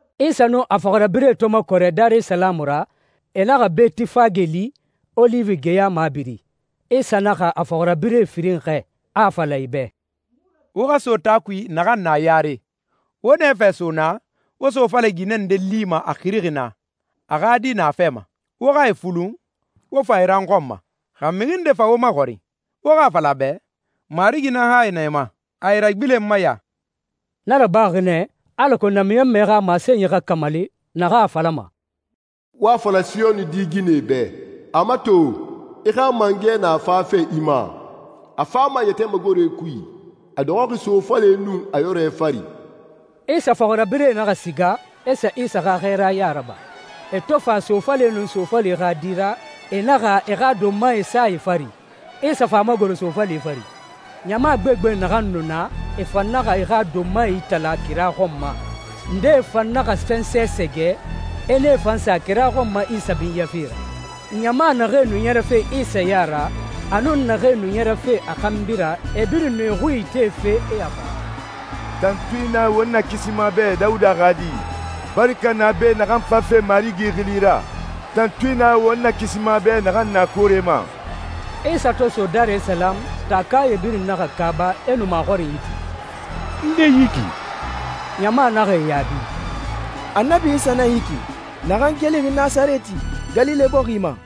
Isa nun a fɔxirabirɛe to makɔrɛ Darisalamu ra, e naxa Betifage li, Oliwi geya mabiri. Isa naxa a fɔxirabirɛ firin xɛɛ, a a fala e bɛ, «Wo xa so taa kui naxan na yare. Wo nɛfɛ so naa, wo sofale ginɛ nde lima a xirixi naa, a xa di na a fɛ ma. Wo xa e fulun, wo fa e ra n xɔn ma. Xa mixi nde fa wo maxɔrin, wo xa a fala a bɛ, ‹Marigi nan hayi na e ma. A e ragbilenma ya.›» Na rabaxi nɛ, alako namiɲɔnmɛ xa masenyi xa kamali, naxan a falama, «Wo a fala Siyoni di ginɛ bɛ, ‹A mato, i xa mangɛ na fafe i ma. A fama yɛtɛ magore kui, a dɔxɔxi sofale nun a yɔrɛ fari.›» Isa fɔxirabirɛe naxa siga, e sa Isa xa xɛɛraya raba. E to fa sofale nun sofale xa di ra, e naxa e xa donmae sa e fari, Isa fa a magoro sofale fari. Ɲama gbegbe naxan nu na, e fan naxa e xa donmae itala kira xɔn ma, ndee fan naxa fɛnsɛ sɛgɛ, e nee fan sa kira xɔn ma Isa binyafe ra. Ɲama naxee nu ɲɛrɛfe Isa ya ra, a nun naxee nu ɲɛrɛfe a xanbi ra, e birin nu e xui itefe, e a fala, «Tantui na won Nakisima bɛ, Dawuda xa Di! Baraka na a bɛ naxan fafe Marigi xili ra! Tantui na won Nakisima bɛ naxan na koore ma!» Isa to so Darisalamu, taakae birin naxa kaaba, e nu maxɔrinyi ti, «Nde yi ki?» Ɲama naxa e yaabi, «Annabi Isa nan yi ki, naxan kelixi Nasarɛti, Galile bɔxi ma.»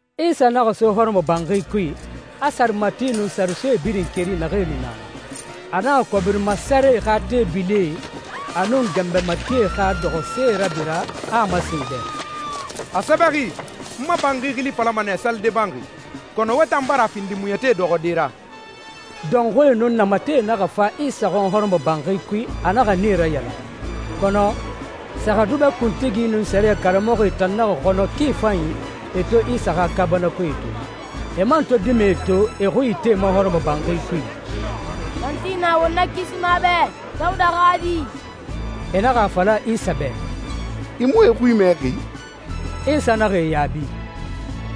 Isa naxa so hɔrɔmɔbanxi kui, a sarematie nun saresoe birin keri naxee nu na na. A naxa kɔbiri masarɛe xa teebilie a nun ganbɛ matie xa dɔxɔsee rabira, a a masen e bɛ, «A sɛbɛxi, ‹N ma banxi xili falama nɛ, salide banxi,› kɔnɔ wo tan bara a findi muɲɛtie dɔxɔde ra.» Dɔnxuie nun namatɛe naxa fa Isa xɔn hɔrɔmɔbanxi kui, a naxa nee rayalan. Kɔnɔ sɛrɛxɛdubɛ kuntigie nun sɛriyɛ karamɔxɔe tan naxa xɔnɔ ki fanyi e to Isa xa kaabanakoe to, e man to dimɛe to e xui itema hɔrɔmɔbanxi kui, «Tantui na won Nakisima bɛ, Dawuda xa Di!» E naxa a fala Isa bɛ, «I mu e xui mɛxi?» Isa naxa e yaabi,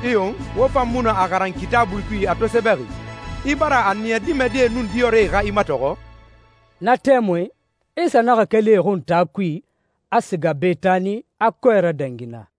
«Iyo. Wo fan mu nu a xaran Kitaabui kui a to sɛbɛxi, ‹I bara a niya dimɛdie nun diyɔrɛe xa i matɔxɔ?›» Na tɛmui, Isa naxa keli e xun taa kui, a siga Betani, a kɔɛ radangi naa.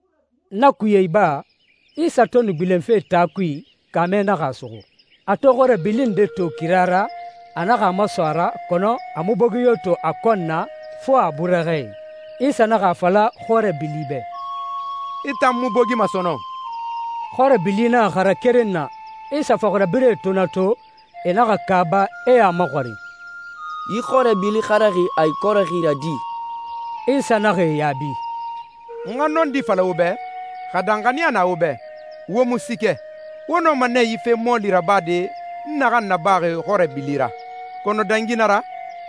Na kuye iba, Isa to nu gbilenfe taa kui, kaamɛ naxa a suxu. A to xɔrɛ bili nde to kira ra, a naxa a maso a ra kɔnɔ a mu bogi yo to a kɔn na, fo a burɛxɛe. Isa naxa a fala xɔrɛ bili bɛ, «I tan mu bogima sɔnɔn!» Xɔrɛ bili naxa xara keren na. Isa fɔxirabirɛe to na to, e naxa kaaba, e a maxɔrin, «Yi xɔrɛ bili xaraxi a ikɔrɛxi ra di?» Isa naxa e yaabi, «N xa nɔndi fala wo bɛ, xa danxaniya na wo bɛ, wo mu siikɛ, wo nɔma nɛ yi fe mɔɔli nabade n naxan nabaxi xɔrɛ bili ra. Kɔnɔ dangi na ra,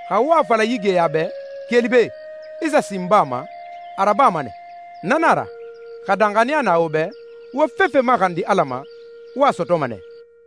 xa wo a fala yi geya bɛ, ‹Keli be, i sa sin baa ma,› a rabama nɛ. Na nan a ra, xa danxaniya na wo bɛ, wo fefe maxandi Ala ma, wo a sɔtɔma nɛ.»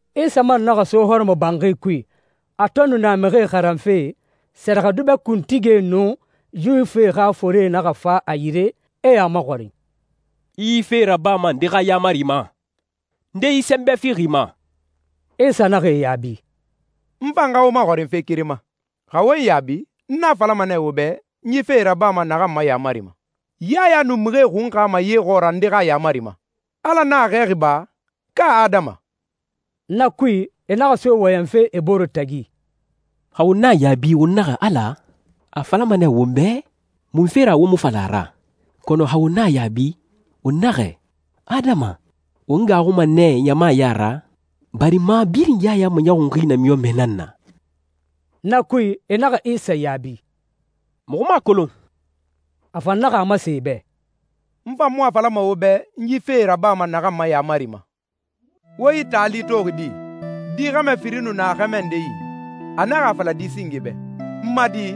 Isa man naxa so hɔrɔmɔbanxi kui. A to nu na mixie xaranfe, sɛrɛxɛdubɛ kuntigie, nun Yuwifie xa forie naxa fa a yire, e a maxɔrin, «I yi fee rabama nde xa yaamari ma? Nde yi sɛnbɛ fixi i ma?» Isa naxa e yaabi, «N fan xa wo maxɔrin fe keren ma. Xa wo n yaabi, n a falama nɛ wo bɛ n yi fee rabama naxan ma yaamari ma. Yaya nu mixie xunxama ye xɔɔra nde xa yaamari ma? Ala nan a xɛɛxi ba, ka adama?» Na kui, e naxa so wɔyɛnfe e bore tagi, «Xa won na a yaabi, won naxɛ, ‹Ala,› a a falama nɛ won bɛ, ‹Munfe ra wo mu fa la a ra?› Kɔnɔ xa won na a yaabi, won naxɛ, ‹Adama,› won gaaxuma nɛ ɲama ya ra, barima birin Yaya maɲɔxunxi namiɲɔnmɛ nan na.» Na kui, e naxa Isa yaabi, «Muxu mu a kolon.» A fan naxa a masen e bɛ, «N fan mu a falama wo bɛ n yi fee rabama naxan ma yaamari ma.» «Wo yi taali toxi di? Di xɛmɛ firin nu na xɛmɛ nde yi. A naxa a fala di singe bɛ, ‹N ma di,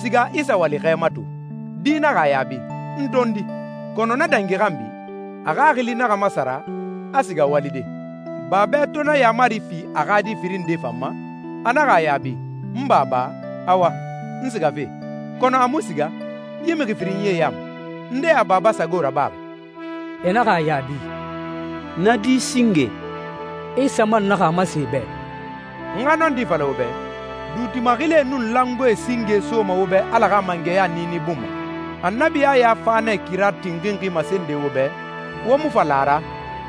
siga i sa wali xɛ ma to.› Di naxa a yaabi, ‹N tondi.› Kɔnɔ na dangi xanbi, a xaxili naxa masara, a siga walide. Babɛ to na yaamari fi a xa di firin nde fan ma, a naxa a yaabi, ‹N Baba, awa, n sigafe.› Kɔnɔ a mu siga. Yi mixi firinyie ya ma, nde a baba sago rabaxi?» E naxa a yaabi, «Na di singe.» Isa man naxa a masen e bɛ, «N xa nɔndi fala wo bɛ, duuti maxilie nun langoee singe soma wo bɛ Ala xa mangɛya niini bun ma. Annabi Yaya fa nɛ kira tinxinxi masende wo bɛ, wo mu fa la a ra.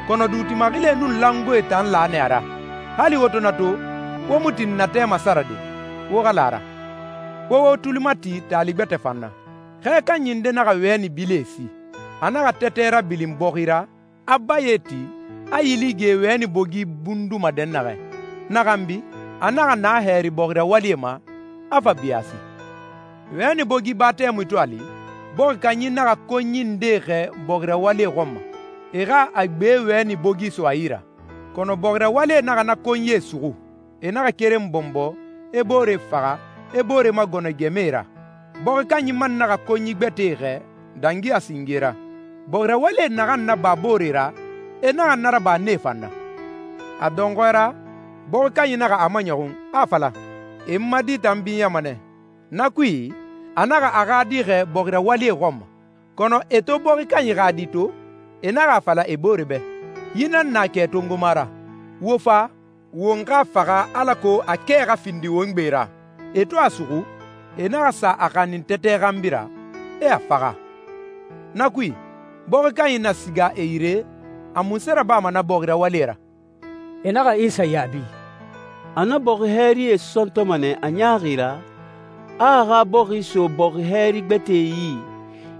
Kɔnɔ duuti maxilie nun langoee tan la nɛ a ra. Hali wo to na to, wo mu tin natɛ masarade, wo xa la a ra.» «Wo wo tuli mati taali gbɛtɛ fan na. Xɛ kanyi nde naxa wɛni bilie si. A naxa tɛtɛ rabilin bɔxi ra, a baye ti, a yili ge wɛni bogi bunduma dɛnnaxɛ. Na xanbi, a naxa na hɛri bɔxi rawalie ma, a fa biyaasi. Wɛni bogi ba tɛmui to a li, bɔxi kanyi naxa konyi ndee xɛɛ bɔxi rawalie xɔn ma, e xa a gbe wɛni bogi so a yi ra. Kɔnɔ bɔxi rawalie naxa na konyie suxu. E naxa keren bɔnbɔ, e boore faxa, e boore magɔnɔ gɛmɛe ra. Bɔxi kanyi man naxa konyi gbɛtɛe xɛɛ dangi a singe ra. Bɔxi rawalie naxan naba booree ra, e naxa na raba nee fan na. A dɔnxɔɛ ra, bɔxi kanyi naxa a maɲɔxun, a a fala, ‹E n ma di tan binyama nɛ.› Na kui, a naxa a xa di xɛɛ bɔxi rawalie xɔn ma. Kɔnɔ e to bɔxi kanyi xa di to, e naxa a fala e bore bɛ, ‹Yi nan na kɛ tongoma ra. Wo fa, won xa a faxa alako a kɛ xa findi won gbe ra.› E to a suxu, e naxa sa a xanin tɛtɛ xanbi ra, e a faxa.» «Na kui, bɔxi kanyi na siga e yire, a munse rabama na bɔxi rawalie ra?» E naxa Isa yaabi, «A na bɔxi hɛrie sɔntɔma nɛ a ɲaaxi ra, a a xa bɔxi so bɔxi hɛri gbɛtɛe yi,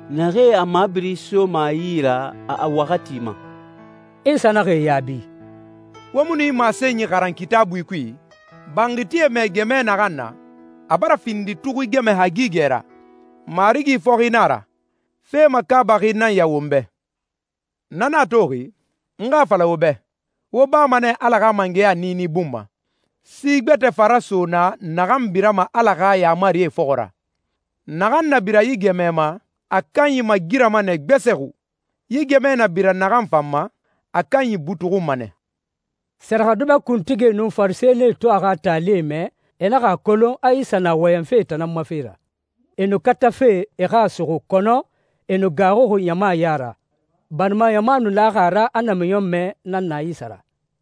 naxee a mabiri soma a yi ra a waxati ma.» Isa naxa e yaabi, «Wo mu nu yi masenyi xaran Kitaabui kui? ‹Banxitie mɛɛ gɛmɛ naxan na, a bara findi tuxui gɛmɛ hagigɛ ra. Marigi fɔxi nan a ra. Fe makaabaxi nan ya won bɛ.›» «Na nan a toxi, n xa a fala wo bɛ, wo bama nɛ Ala xa mangɛya niini bun ma, si gbɛtɛ fa raso naa naxan birama Ala xa yaamarie fɔxɔ ra. Naxan na bira yi gɛmɛ ma, a kanyi magirama nɛ gbɛsɛxu. Yi gɛmɛ na bira naxan fan ma, a kanyi butuxunma nɛ.» Sɛrɛxɛdubɛ kuntigie nun Farisɛnie to a xa taalie mɛ, e naxa a kolon a Isa nu na wɔyɛnfe e tan nan ma fe ra. E nu katafe e xa a suxu, kɔnɔ e nu gaaxuxi ɲama ya ra, barima ɲama nu laxi a ra, a namiɲɔnmɛ nan na Isa ra.